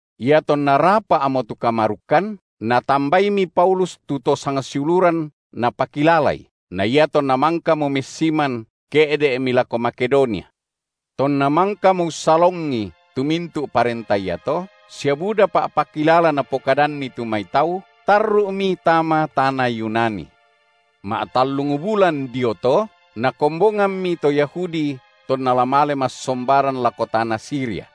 Iatonna rapa’mo tu kamarukkan, natambaimi Paulus tu to sangsiuluran napakilalai, na iatonna mangkamo messiman, ke’de’mi lako Makedonia. Tonna mangkamo ussalongi tu mintu’ parenta iato sia buda pa’pakilala napokadanni tu mai tau, tarru’mi tama tana Yunani. Ma’tallung bulan dio to, nakombongammi to Yahudi tonna la male massombaran lako tana Siria.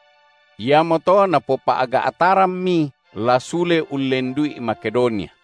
Iamoto napopa’ga’tarammi la sule ullendu’i Makedonia.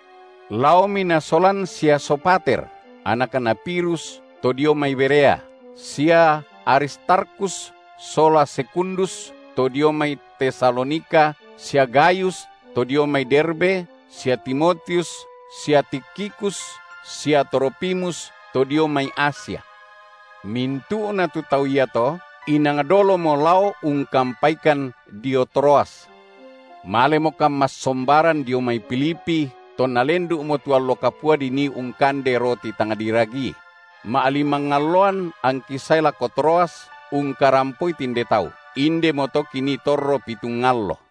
Laomi nasolan sia Sopater, anakna Pirus to dio mai Berea, sia Aristarkhus sola Sekundus to dio mai Tesalonika sia Gayus to dio mai Derbe sia Timotius sia Tikhikus sia Trofimus to dio mai Asia. Mintu’na tu tau iato inang dolomo lao ungkampaikan dio Troas. Malemokan massombaran dio mai Filipi tonna lendu’mo tu allo kapua dinii ungkande roti tang diragii; ma’limang alloan angki sae lako Troas ungkarampoi tinde tau. Indemoto kinii torro pitung allo.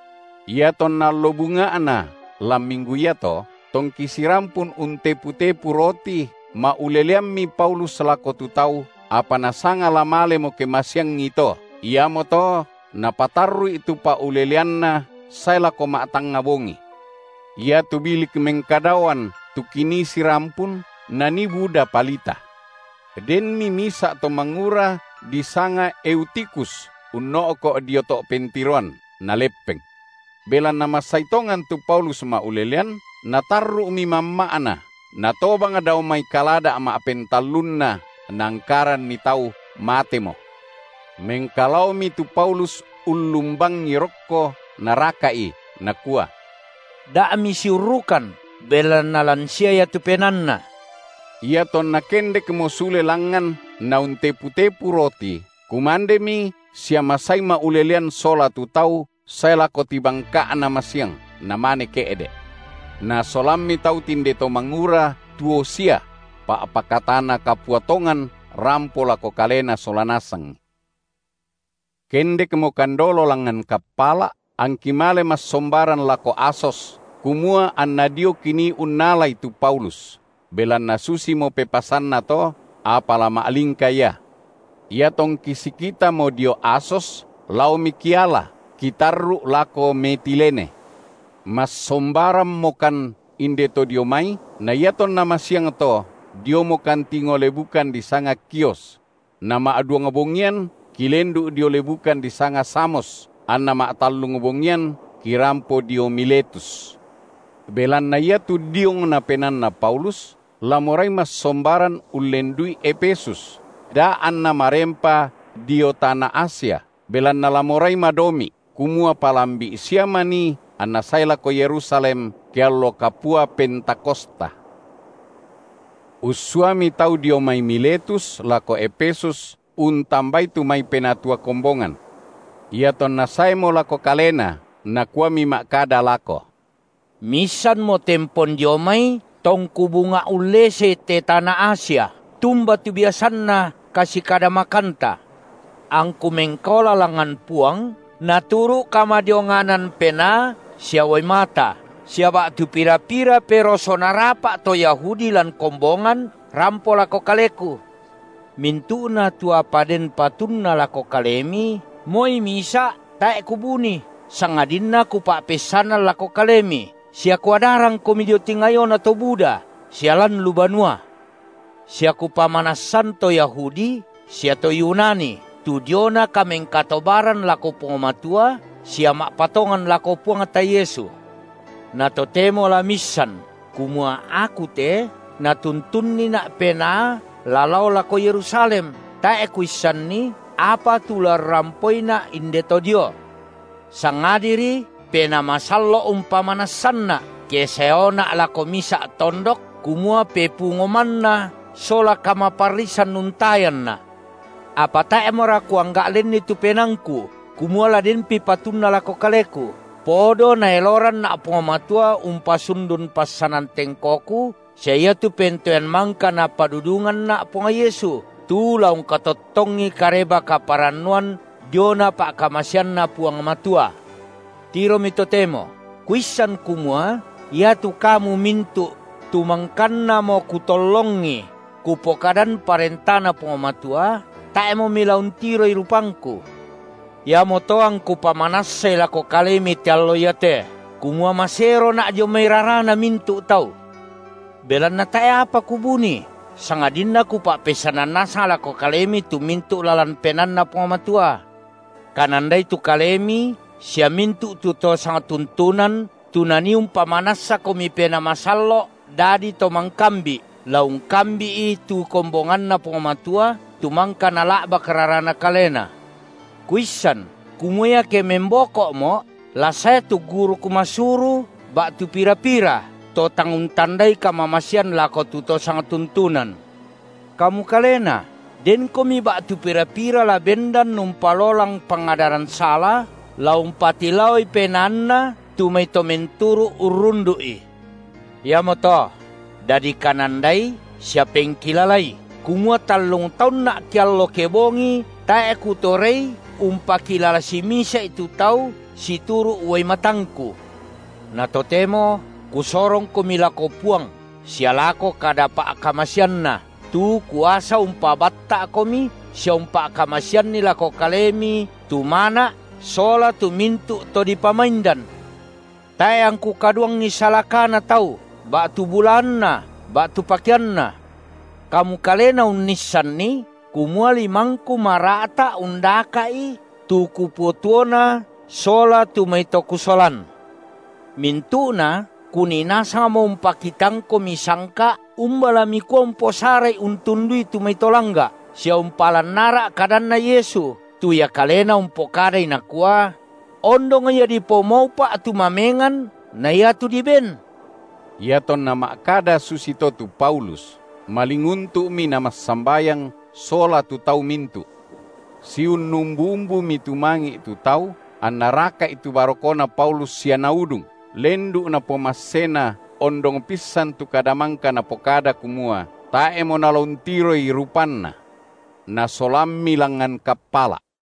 Iatonna allo bunga’na lan minggu iato, tongki sirampun untepu-tepu roti, ma’uleleammi Paulus lako tu tau, apa nasanga la malemo ke masiangito, iamoto napatarru’i tu pa’uleleanna sae lako ma’tangnga bongi. Iatu bilik mengkadaoan tu kinii sirampun, nanii buda palita. Denmi misa’ to mangura disanga Eutikhus unno’ko’ dio to’ pentiroan, naleppeng. Belanna masai tongan tu Paulus ma’ulelean, natarru’mi mamma’na, natobang dao mai kalada’ ma’pentallunna, naangkaranni tau matemo. Mengkalaomi tu Paulus ullumbangi rokko naraka’i, nakua: Da misiurrukan, belanna lan sia ia tu penaanna. Iatonna kendekmo sule langngan nauntepu-tepu roti, kumandemi sia masai ma’ulelean sola tu tau sae lako tibangka’na masiang, namane ke’de’. Nasolammi tau tinde to mangura tuo sia: pa’pakatana kapua tongan rampo lako kalena sola nasangi. Kendekmokan dolo langngan kappala’, angki male massombaran lako Asos, kumua anna dio kinii unnalai tu Paulus, belanna susimo pepasanna to, apa la ma’lingka ia. Iatongki sikitamo dio Asos laomi kiala, kitarru’ lako Metilene. Massombarammokan inde to dio mai, na iatonna masiangto, diomokan tingo lebukan disanga Khios; nama’duang bongian, kilendu’ dio lebukan disanga Samos, anna ma’tallung bongian kirampo dio Miletus. Belanna iatu diongna penaanna Paulus la morai massombaran ullendu’i Efesus, da anna marempa dio tana Asia, belanna la morai madomi’, kumua palambi’ sia manii anna sae lako Yerusalem, ke allo kapua Pentakosta. Ussuami tau dio mai Miletus lako Efesus untambai tu mai penatua kombongan. Iatonna saemo lako kalena, nakuami ma’kada lako: Miissanmo tempon dio mai tongku bunga’ ullesei te tana Asia, tumba tu biasanna kasikadamakanta, angku mengkaola langngan Puang, naturu’ kamadionganan penaa sia uai mata, sia ba’tu pira-pira peroso narapa’ to Yahudi lan kombongan rampo lako kaleku; mintu’na tu apa den patunna lako kalemi, moi mia’ tae’ kubuni, sangadinna kupa’peissanan lako kalemi, sia kuadarangkomi dio tingayona to buda sia lan lu banua; sia kupamanassan to Yahudi sia to Yunani tu diona kamengkatobaran lako Puang Matua sia ma’patongan lako Puangta Yesu. Na totemo la miissan kumua: aku te natuntunnina’ Penaa la lao lako Yerusalem, tae’ kuissanni apa tu la urrampoina’ inde to dio. Sangadiri Penaa Masallo’ umpamanassanna’ ke saeona’ lako misa’ tondok kumua pepungo manna sola kamaparrisan untayanna’. Apa tae’mora kuangga’ lenni tu penaangku kumua la denpi patunna lako kaleku, podo Naeloranna’ Puang Matua umpasundun passanan tengkoku sia iatu pentoean mangka Napadudunganna’ Puang Yesu, tu la ungkatottongi Kareba-kaparannuan diona pa’kamaseanNa Puang Matua. Tiromi totemo, kuissan kumua iatu kamu mintu’ tu mangkannamo kutollongi kupokadan ParentaNa Puang Matua, tae’mo mila untiroi rupangku. Iamoto angku pamanassai lako kalemi te allo iate kumua maserona’ dio mai rarana mintu’ tau. Belanna tae’ apa kubuni, sangadinna kupa’peissanan nasang lako kalemi tu mintu’ lalan penaanNa Puang Matua. Kanandai tu kalemi sia mintu’ tu to sangtuntunan, tu Nanii umpamanassakomi Penaa Masallo’ dadi to mangkambi’, la ungkambi’i tu kombonganNa Puang Matua, tu mangka Nala’bak raraNa kalena. Kuissan, kumua iake memboko’mo’ la sae tu guruk masuru ba’tu pira-pira, to tang untandai kamamasean lako tu to sangtuntunan. Kamu kalena denkomi ba’tu pira-pira la bendan umpalolang pangadaran sala la umpatilaoi penaanna tu mai to menturu urrundu’i. Iamoto dadi kanandai sia pengkilalai kumua tallung taunna’ keallo kebongi tae’ kutorei umpakilala simisa’i tu tau situru’ uai matangku. Na totemo kusorongkomi lako Puang sia lako kada pa’kamaseanNa, tu kuasa umpabatta’komi sia umpa’kamaseanni lako kalemi tu mana’ sola tu mintu’ to dipamaindan. Tae’ angku kaduangi salakana tau ba’tu bulaanna ba’tu pakeanna. Kamu kalena unnissanni kumua limangku mara’ta undaka’i tu kupotuona sola tu mai to kusolan. Mintu’na kunii nasangmo umpakitangkomi sangka’ umba la mikua umposara’i untundui tu mai to langga’, sia umpalan ara’ kadanNa Yesu, tu Ia kalena umpokadai Nakua: Ondong ia dipomaupa’ tu mamengan na iatu diben. Iatonna ma’kada susito tu Paulus, malinguntu’mi namassambayang sola tu tau mintu’. Siunnumbu-umbumi tumangi’ tu tau, anna raka’i tu barokona Paulus sia naudung, lendu’ napomassena ondong pissan tu kada mangka napokada kumua, tae’mo nala untiroi rupanna. Nasolammi langngan kappala’.